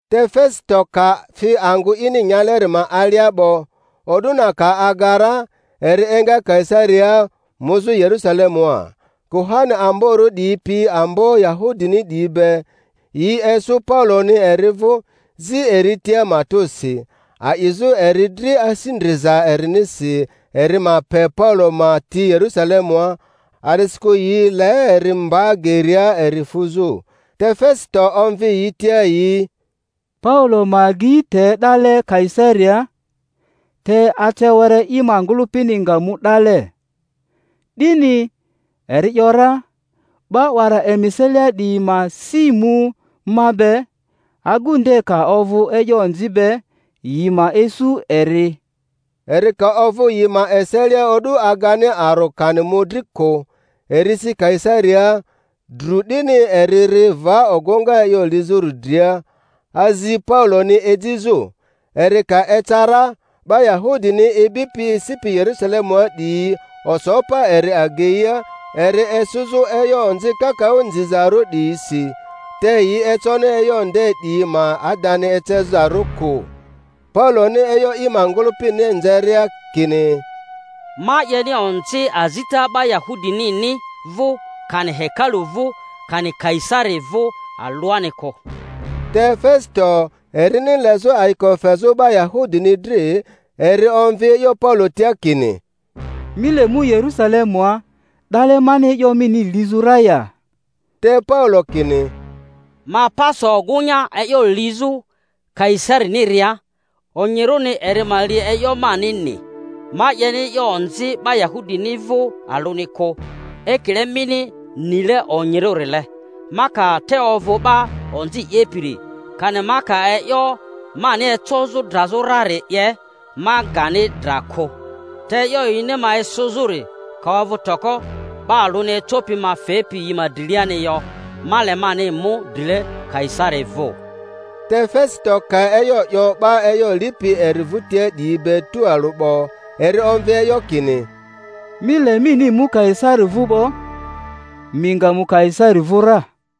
Te Fesito ka fi angᴜ ini nyaleri ma alia 'bo, o'du na ka aga ra, eri enga Kaisariaa muzᴜ Yerᴜsalemua. Kuhani amborᴜ 'diyi pi ambo Yahudini 'diyi be, yi esᴜ Pauloni eri vᴜ, zi eri tia matᴜsi, a'izᴜ eri dri asi ndriza erinisi eri ma pe Paulo ma ti Yerusalemua, a'disikᴜ yi le eri mba geria eri fuzᴜ. Te Fesito omvi yi tia yi Paulo ma agei te 'dale Kaisariaa, te ace were i ngᴜlᴜpini nga mu 'dale. 'Dini, eri ‘yora, 'ba 'wara emi eselia 'diyi ma si mu ma be, agu nde ka ovᴜ e'yo onzi be, yi ma esᴜ eri. Eri ka ovᴜ yi ma eselia o'du agani aro kani mᴜdri kᴜ, eri si Kaisariaa; dru 'dini eri ri va ogᴜŋa e'yo lizᴜri dria, azi Pauloni ejizᴜ. Eri ka eca ra, 'ba Yahudini ibipi esipi Yerusalemua 'diyi oso pa eri ageia eri esᴜzᴜ e'yo onzi kakaᴜ nzizarᴜ 'diyisi, te yi econi e'yo nde 'diyi ma adani ecezarᴜ kᴜ. Pauloni e'yo i ma ngᴜlᴜpini nzeria, kini, Ma 'yeni onzi azita 'ba Yahudinini vᴜ, kani hekalu vᴜ, kani Kaisari vᴜ alᴜani kᴜ. Te Fesito, erini lezᴜ ayiko fezᴜ 'ba Yahudini dri, eri omvi e'yo Paulo tia kini, Mi le mu Yerᴜsalemua, 'dale mani e'yo mini lizᴜ ra ya? Te Paulo kini, Ma pa so ogᴜŋa e'yo lizᴜ Kaisariniria; onyirᴜni eri ma li e'yo manini; ma 'yeni e'yo onzi 'ba Yahudini vᴜ alᴜni kᴜ, ekile mini nile onyirᴜrile. Ma ka te ovᴜ 'ba onzi 'yepiri, kani ma ka e'yo mani ecozᴜ drazᴜ rari 'ye, ma gani dra kᴜ; te e'yo yini ma esᴜzᴜri ka ovᴜ toko, 'ba alᴜni ecopi ma fepi yi ma driani yo. Ma le mani mu drile Kaisari vᴜ. Te Fesito ka e'yo 'yo 'ba e'yo lipi eri vᴜtia 'diyi be tualᴜ 'bo, eri omvi e'yo kini, Mi le mini mu Kaisari vᴜ 'bo; mi nga mu Kaisari vᴜ ra.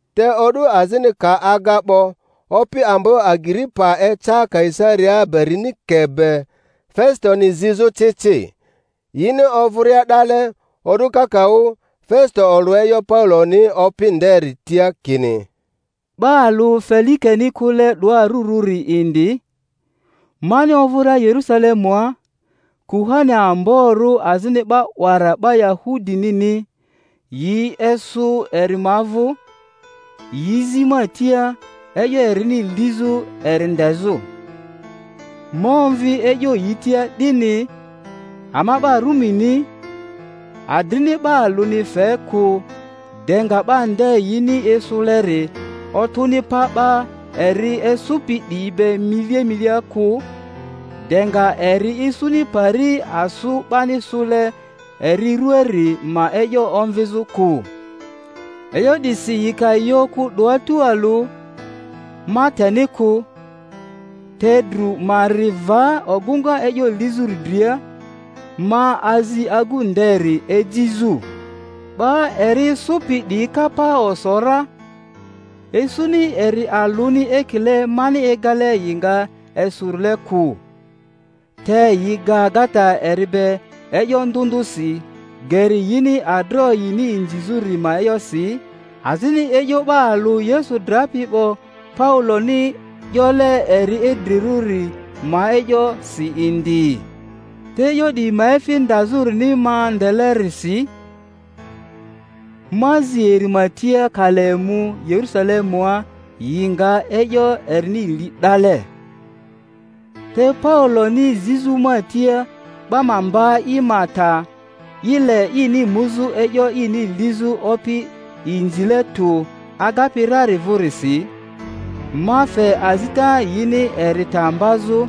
Te o'du azini ka aga 'bo, opi ambo Agiripa eca Kaisariaa Berinike be, Fesitoni zizᴜ ci ci. Yini ovᴜria 'dale o'du kakaᴜ, Fesito olᴜ e'yo Pauloni opi nderi tia kini, 'Ba alᴜ Felikeni kᴜle 'doa arurᴜri indi; mani ovᴜria Yerusalemua, kuhani amborᴜ azini 'ba 'wara 'ba Yahudi-nini yi esᴜ eri ma vᴜ, yi zi ma tia e'yo erini lizᴜ eri ndezᴜ. Ma omvi e'yo yi tia 'dini, ama 'ba Rumini adrini 'ba alᴜni fe kᴜ, de nga 'ba nde yini esᴜleri otᴜni pa 'ba eri esᴜpi 'diyi be milia milia kᴜ, de nga eri isuni pari asᴜ 'bani sᴜle eri ruaari ma e'yo omvizᴜ kᴜ. E'yo 'disi yi ka yi okᴜ 'doa tualᴜ, ma teni kᴜ, te dru ma ri va ogᴜŋa e'yo lizᴜri dria, ma azi agu nderi ejizᴜ. 'Ba eri esᴜpi 'diyi ka pa oso ra, esᴜni eri alᴜni ekile mani egale yi nga esᴜrile kᴜ; te yi ga agata eri be e'yo ndᴜ ndᴜsi geri yini adroᴜ yini nzizᴜ ri ma e'yosi, azini e'yo 'ba alᴜ Yesu drapi 'bo Pauloni 'yole eri idrirᴜri ma e'yosi indi. Te e'yo 'diyi ma efi ndazᴜrini ma ndelerisi, ma zi eri ma tia ka le mu Yerusalemua yi nga e'yo erini li 'dale. Te Pauloni zizᴜ ma tia 'ba ma mba i ma ta, i le ini muzᴜ e'yo ini lizᴜ Opi inzile tu agapi rari vᴜrisi, ma fe azita yini eri ta mbazᴜ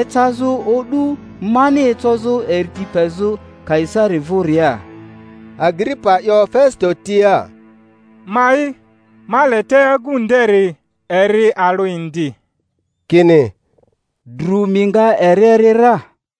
ecazᴜ o'du mani ecozᴜ eri ti pezᴜ Kaisari vᴜria. Agiripa 'yo Fesito tia, Ma'i ma le te agu nderi eri alᴜ indi. Kini, Dru mi nga eri eri ra.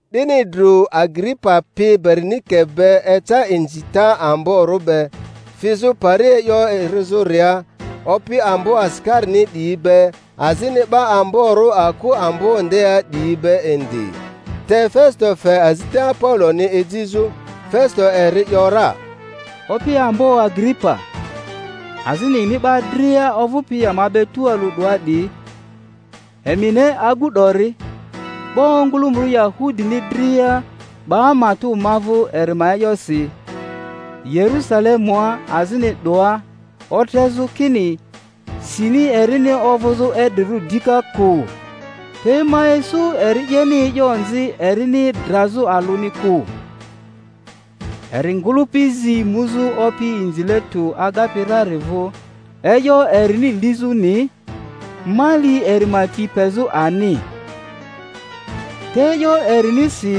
'Dini dru Agiripa pi Berinike be eca inzita amborᴜ be, fizᴜ pari e'yo erizᴜria opi ambo asikarini 'diyi be, azini 'ba amborᴜ aku ambo ndea 'diyi be indi. Te Fesito fe azita Pauloni ejizᴜ. Fesito eri ‘yora, Opi ambo Agiripa, azini emi 'ba dria ovᴜpi ama be tualᴜ 'doa 'diyi, emi ne agu 'dori; 'ba ongᴜlᴜmᴜrᴜ Yahudini dria 'ba matᴜ ma vᴜ eri ma e'yosi, Yerusalemua azini 'doa, otrezᴜ kini sini erini ovᴜzᴜ idrirᴜ dika kᴜ. Te ma isu eri 'yeni e'yo onzi erini drazᴜ alᴜni kᴜ. Eri ngᴜlᴜpi zi muzᴜ opi inzile tᴜ agapi rari vᴜ e'yo erini lizᴜni, ma li eri ma ti pezᴜ ani. Te e'yo erinisi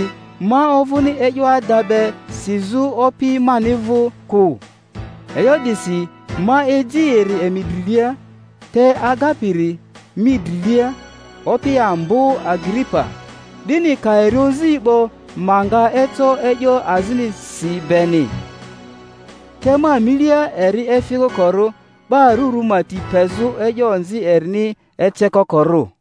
ma ovᴜni e'yo ada be sizᴜ opi mani vᴜ kᴜ. E'yo 'disi ma eji eri emi drilia, te agapiri mi drilia, Opi ambo Agiripa, 'dini ka eri ozi 'bo ma nga eco e'yo azini si beni. Te ma milia eri efi kokorᴜ 'ba arurᴜ ma ti pezᴜ e'yo onzi erini ecekokorᴜ.